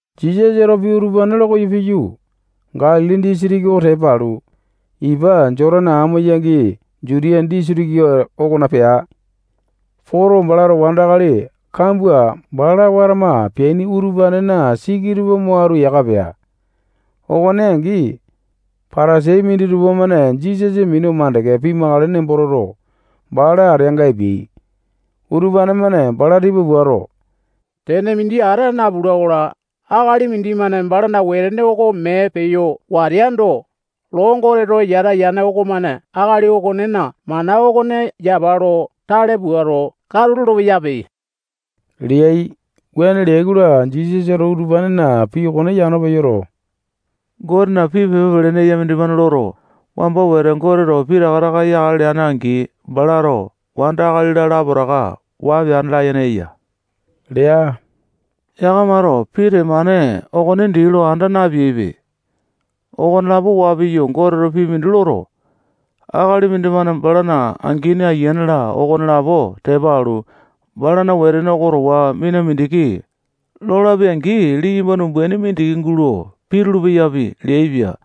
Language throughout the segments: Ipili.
Jisasato pii utupane lo koyo piyu, Galili disitiki oko tepa alu, ipa Jotane amo-yangi Jutiya disitiki okona pea. Poto, balato wandakali kambua bala watama peaini utupanena siki tupa mo atu yaka pea. Okone angi, Patasai minditupa-mane Jisasa minu makande pimakale nembo toto, bala ateanga epeai. Utupane-mane bala tipa puato, tene mindi ata napula-kola, akali mindimane balana wetene oko mee peyo wateando, loo Goteto yata yane okomane akali okonena mana okone yapa lo tale puato, katu lolo-peyape leai. Wuane leai-kola, Jisasato utupanena pii okone yano peyoto, Gotena pii pepa pelene eya mindimane loto, wamba wete Goteto pitaka taka yakale leane-angi, balato wanda, akali-la, lapotaka waa peane layene eya lea. Yakamato pii temane okone dii lo anda napeaipe. Okonelapo waa piyu, Goteto pii mindi loto, akali mindimane balana angini, ayiane-la, okonelapo tepa alu, balana wetene oko towa mina mindiki lolapi-angi, liyamba umbaini mindiki gulo pitulu-peyapi leaipia.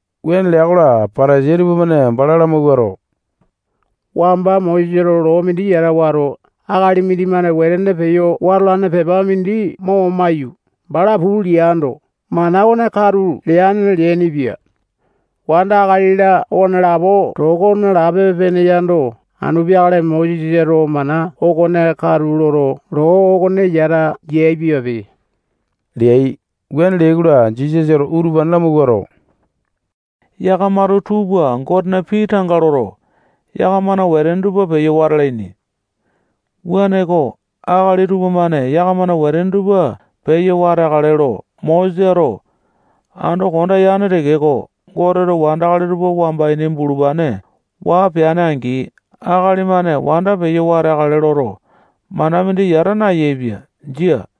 Wuane lea-kola, Patasai tupamane bala lamawuato, wamba Mosesato loo mindi yata wato, akali mindimane wetene peyo watolane pepa mindi mo maiyu, bala puu leando, mana okone katu leane leainipia. Wanda, akali-la, okonelapo toko nalapa-pene yando, anu peakale Mosesato mana okone katu loto, loo okone yata yaepiape leai. Wuane leai-kola, Jisasato utupane lamawuato, yakamato tuu pua Gotena pii tanga loto, yakamana wetene tupa peyo wata alaini. Wuaneko, akali tupamane yakamana wetene tupa peyo wateakale lo Mosesato ando konda yane tekeko, Goteto wandakali tupa wamba ini bulupane waa peane-angi, akali-mane wanda peyo wateakale loto, mana mindi yata nayaepia. Jia.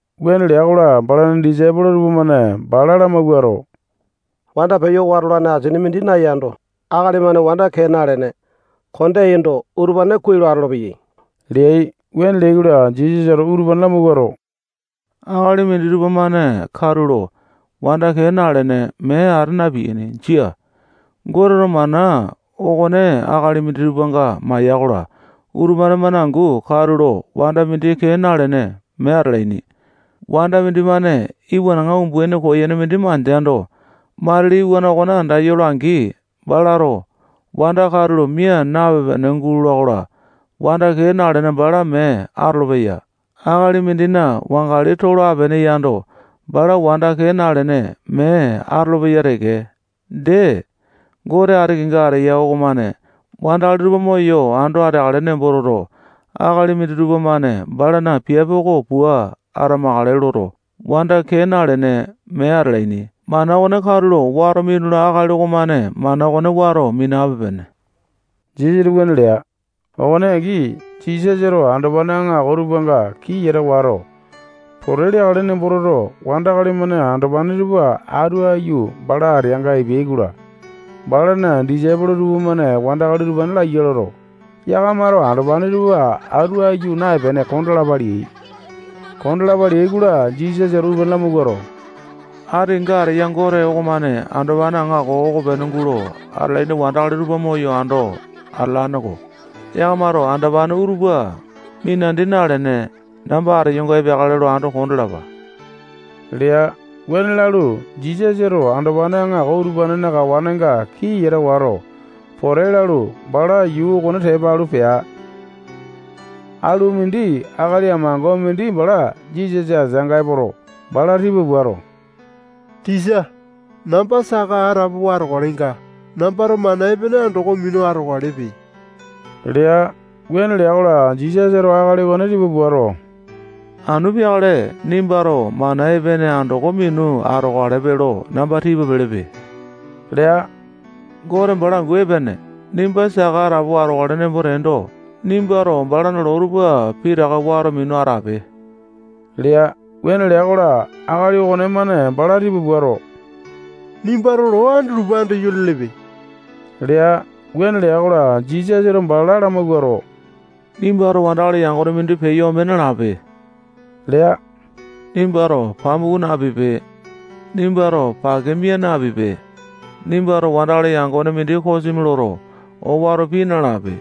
Wuane lea-kola, balana disaipolo tupamane bala lamawuato, wanda peyo watolane asini mindi nayando, akali-mane wanda kee nalene, kondeaindo, utupane kuai lo atolopeyai leai. Wuane leai-kola, Jisasato utupane lamawuato, akali minditupa-mane katulo wanda kee nalene, mee ata na-piyaini. Jia. Goteto mana okone akali minditupanga maya-kola, utupane-mane angu katulo wanda mindi kee nalene, mee atalaini. Wanda mindimane iwanaŋa umbaini koyene mindi mandeando, matili iwana okone andayola-angi, balato wanda katulo mia napepe-pene gulola-kola, wanda kee nalene, bala mee atolopeya. Akali mindina wangali tolo apene yando, bala wanda kee nalene, mee atolopeya teke. Dee, Gote ati kenga ateya okomane wandakali tupa moyo ando ateakale nembo toto, akali minditupa-mane balana piape oko pua atamakale loto, wanda kee nalene, mee atalaini. Mana okone katulo wato minula akali okomane mana okone wato minape-pene. Jisasato wuane lea. Okone angi, Jisasato andopane aŋako tupanga kii yata wato, pote leakale nembo toto, wandakali-mane andopane tupa atu aiyu bala ateanga epeai-kola, balana disaipolo tupamane wandakali utupane laiya loto, yakamato andopane tupa atu aiyu naepene kondalapa leai. Kondalapa leai-kola, Jisasato utupane lamawuato, ati kenga ateya Gote okomane andopane aŋako okopene gulo atalaini wandakali tupa moyo ando atalane-ko. Yakamato andopane utupa minandi nalene, namba ateyonga epeakale lo ando kondalapa lea. Wuane lalu, Jisasato andopane aŋako utupanena kawanenga kii yata wato, pote lalu, bala yuu okone tepa alu, pea. Alu mindi akali amango mindi bala Jisasa ateanga epoto, bala tipa puato, tisa, namba saka atapowa atokalenga, nambato mana epene andoko minu atokalepe lea. Wuane lea-kola, Jisasato akali okone tipa puato, anu peakale nimbato mana epene andoko minu atokalepe lo namba tipa pelepe lea. Gote bala angu epene. Nimba saka atapowa atokale nembo teendo, nimbato balana loo tupa pitaka wato minu atape lea. Wuane lea-kola, akali okonemane bala tipa puato, nimbato loo andutupa andayo lelepe lea. Wuane lea-kola, Jisasato bala lamawuato, nimbato wandakali yangone mindi peyo ome nalape lea. Nimbato pamuku napipe. Nimbato pake mia napipe. Nimbato wandakali yangone mindi kosimi loto, owato pii nalape.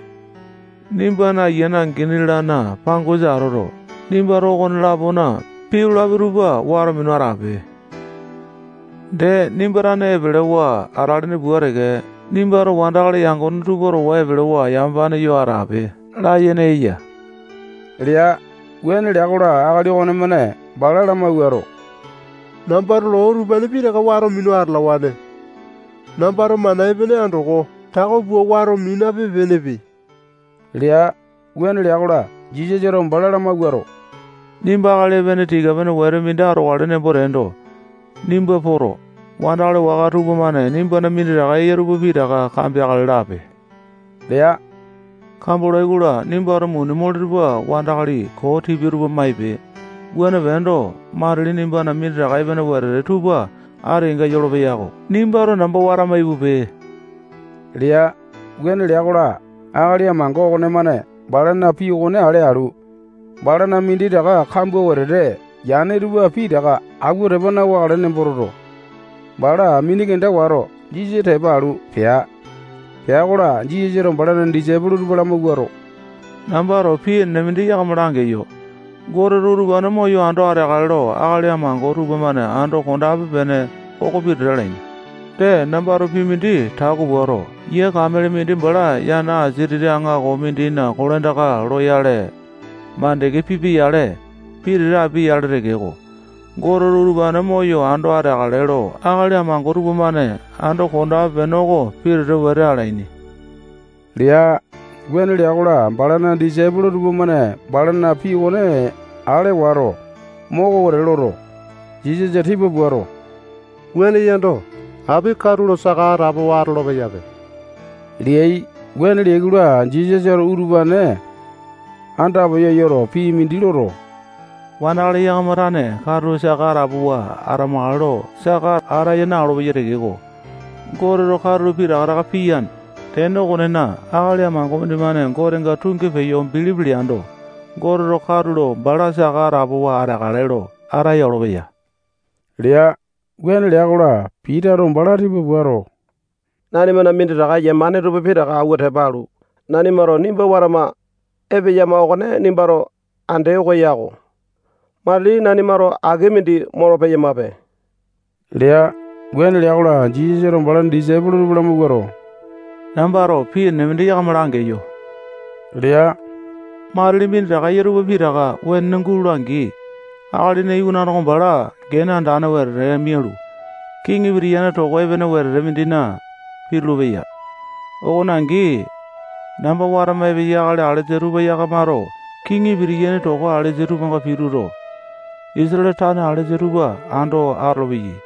Nimbana angini, ayiane-lana pangosa atoto, nimbato okone-lapona pii lolapi tupa wato minu atape. Dee, nimba tane epelewa atalene pua teke, nimbato wandakali yangone tupa towa epelewa yamapane yo atape layene eya lea. Wuane lea-kola, akali okonemane bala lamawuato, nambato loo utupane pitaka wato minu atalawane. Nambato mana epene andoko tako pua wato minape-penepe lea. Wuane lea-kola, Jisasato bala lamawuato, nimba akali epene tika-pene wete mindi atokale nembo teendo, nimba poto, wandakali waka tupamane nimbana minditaka eya tupa pitaka kambeakale lape lea. Kambolai-kola, nimbato muni mole tupa wandakali koo tipia tupa maipe. Wuane peendo, matili nimbana minditaka epene wetete tupa ati kenga yolopeya-ko. Nimbato namba watama ipupe lea. Wuane lea-kola, akali amango okonemane balana pii okone ale alu, balana minditaka kambua wetete yane tupa pitaka awua tepa na-wakale nembo toto, bala mini kenda wato, Jisasa tepa alu, pea. Pea-kola, Jisasato balana disaipolo tupa lamawuato, nambato pii enene mindi yakama langeyo. Goteto utupane moyo ando ateakale lo akali amango tupamane ando kondape-pene oko pitete alaini. Dee, nambato pii mindi tako puato, yia kamele mindi bala yana asia titi aŋako mindina kolandaka loyale makande pipia-yale, pitete apia-yale tekeko, Goteto utupane moyo ando ateakale lo akali amango tupamane ando kondape-pene oko pitete wete alaini lea. Wuane lea-kola, balana disaipolo tupamane balana pii okone ale wato, moko wete loto, Jisasa tipa puato, wuane yando, api katulo saka atapowa atolo-peyape leai. Wuane leai-kola, Jisasato utupane andapeyo yoto, pii mindi loto, wandakali yakama tane katulo saka atapowa atamakale lo saka ataya na-olopeyai tekeko, Goteto katulo pitaka taka piyane. Tene okonena, akali amango mindimane Gotenga tungi peyo bilipi leando, Goteto katulo bala saka atapowa ateakale lo ataya olopeya lea. Wuane lea-kola, Pitato bala tipa puato, nanimana minditaka yemane tupa pitaka awua tepa alu, nanimato nimba watama epeyama okone nimbato andee oko yako. Matili nanimato aki mindi molo-peyamape lea. Wuane lea-kola, Jisasato balana disaipolo tupa lamawuato, nambato pii enene mindi yakama langeyo lea. Matili minditaka eya tupa pitaka wenene gulola-angi, Akalina Iwanane oko bala gene andane wetete mialu, kiŋi pitiyane toko epene wetete mindina pitulu-peya. Okone angi, namba watama epeyai akali alesa tupa yakamato kiŋi pitiyaini toko alesa tupanga pituto, Isatale tane alesa tupa ando atolopeyai.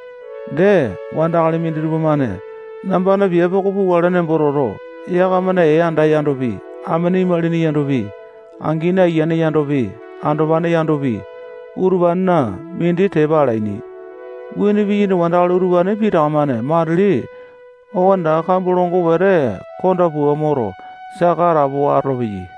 Dee, wandakali minditupa-mane nambana piape oko pukale nembo toto, yakamana ee anda yandopi, amene imalini yandopi, angini ayiane yandopi, andopane yandopi, utupanena mindi tepa alaini. Wuane piyaini wandakali utupane pitaka-mane matili okonetaka kambua longo wete konda pua moto, saka atapowa atolopeyai.